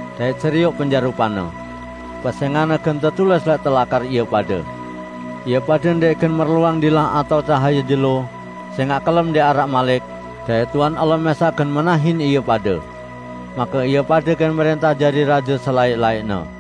dait serioq penjarupan-Ne. Pesẽngan-Ne gen tetulis lẽq telakar ie pade. Ie pade ndẽq gen merluang dilah atao cahaye jelo, sẽngaq kelem ndẽq araq malik, dait Tuhan Allah mẽsaq gen menahin ie pade. Make ie pade gen mrẽntah jari raje selaẽq-laẽqne.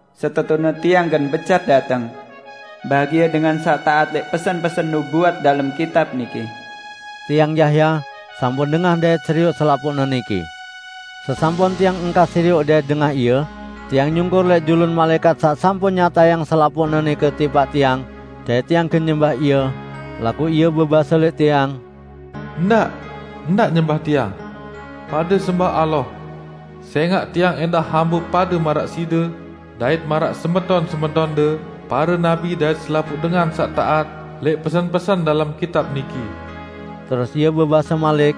"Setetune Tiang gen becat dateng! Bahagie dengan saq taat lẽq pesen-pesen nubuat dalem kitab niki!" Tiang, Yahya, sampun dengah dait serioq selapuqne niki. Sesampun tiang engkah serioq dait dengah ie, tiang nyungkur lẽq julun malaẽkat saq sampun nyatayang selapuqne nike tipaq tiang, dait tiang gen nyembah ie, laguq ie bebase lẽq tiang, "Ndaq! Ndaq nyembah tiang! Pade sembah Allah! Sẽngaq tiang ẽndah hambe pade maraq side, dait maraq semeton-semetonde pare nabi dait selapuq dengan saq taat lẽq pesen-pesen dalem kitab niki!" Terus ie bebase malik,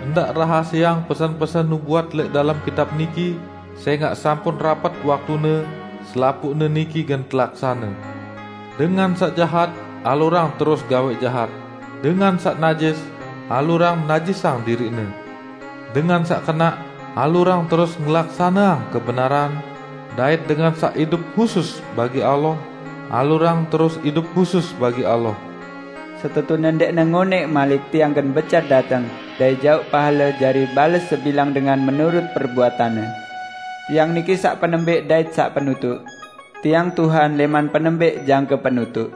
"Ndaq rahasieang pesen-pesen nubuat lẽq dalem kitab niki, sẽngaq sampun rapet waktune selapuqne niki gen telaksane. Dengan saq jahat, alurang terus gawẽq jahat; dengan saq najis, alurang najisang diriqne; dengan saq kenaq, alurang terus ngelaksaneang kebenaran, dait dengan saq idup husus bagi Allah, alurang terus idup husus bagi Allah." "Setetune ndẽqne ngonẽq malik Tiang gen becat dateng dait jauq pahale jari bales sebilang dengan menurut perbuatanne. Tiang niki saq penembẽq dait saq penutuq; Tiang Tuhan lẽman Penembẽq jangke Penutuq."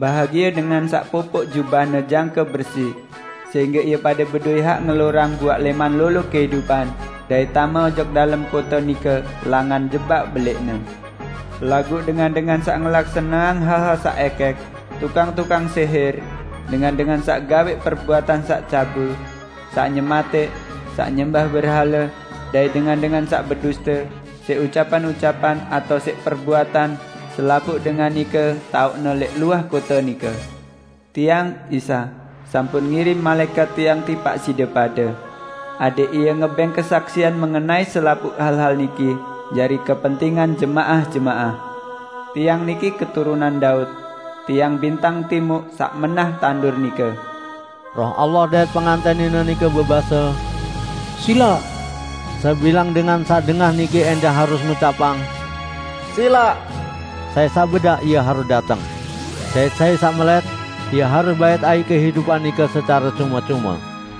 Bahagie dengan saq popoq jubahne jangke bersi sehingge ie pade bedowẽ hak ngelorang buaq lẽman lolo kehidupan dait tame ojok dalem kote nike langan jebak belẽqne. Laguq dengan-dengan saq ngelaksaneang hal-hal saq ẽkẽk, tukang-tukang sẽhẽr, dengan-dengan saq gawẽq perbuatan saq cabul, saq nyematẽq, saq nyembah berhale, dait dengan-dengan saq beduste, siq ucapan-ucapan atao siq perbuatan, selapuq dengan nike taoqne lẽq luah kote nike. "Tiang, Isa, sampun ngirim malaẽkat Tiang tipaq side pade, adẽq ie ngebẽng kesaksian mengenai selapuq hal-hal niki jari kepentingan jemaah-jemaah. Tiang niki keturunan Daud; Tiang bintang timuq saq menah tandur nike." Roh Allah dait Pengantẽn Nine nike bebase, "Silaq!" Sebilang dengan saq dengah niki ẽndah harus ngucapang, "Silaq!". Sai saq bedak, ie harus dateng! Dait sai saq melẽt, ie harus bait aiq kehidupan nike secare cume-cume.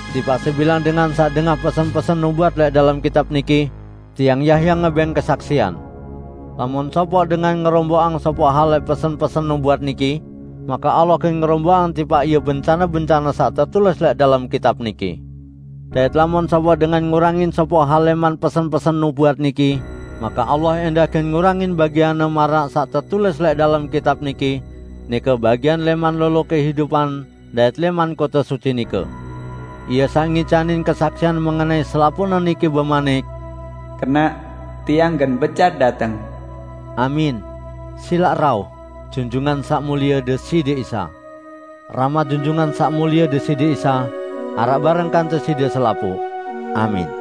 Tipaq sebilang dengan saq dengah pesen-pesen nubuat lẽq dalem kitab niki, tiang, Yahya ngebẽng kesaksian: "Lamun sopoq dengan ngeromboqang sopoq hal lẽq pesen-pesen nubuat niki, make Allah gen ngeromboqang tipaq ie bencane-bencane saq tetulis lẽq dalem kitab niki. Dait lamun sopoq dengan ngurangin sopoq hal lẽman pesen-pesen nubuat niki, make Allah ẽndah gen ngurangin bagianne maraq saq tetulis lẽq dalem kitab niki -- nike bagian lẽman lolo kehidupan dait lẽman kote suci nike." Ie saq ngicanin kesaksian mengenai selapuqne niki bemanik, "Kenaq, Tiang gen becat dateng!" Amin! Silaq rauh, Junjungan Saq Mulie Deside Isa! Rahmat Junjungan Saq Mulie Deside Isa araq bareng kance side selapuq! Amin.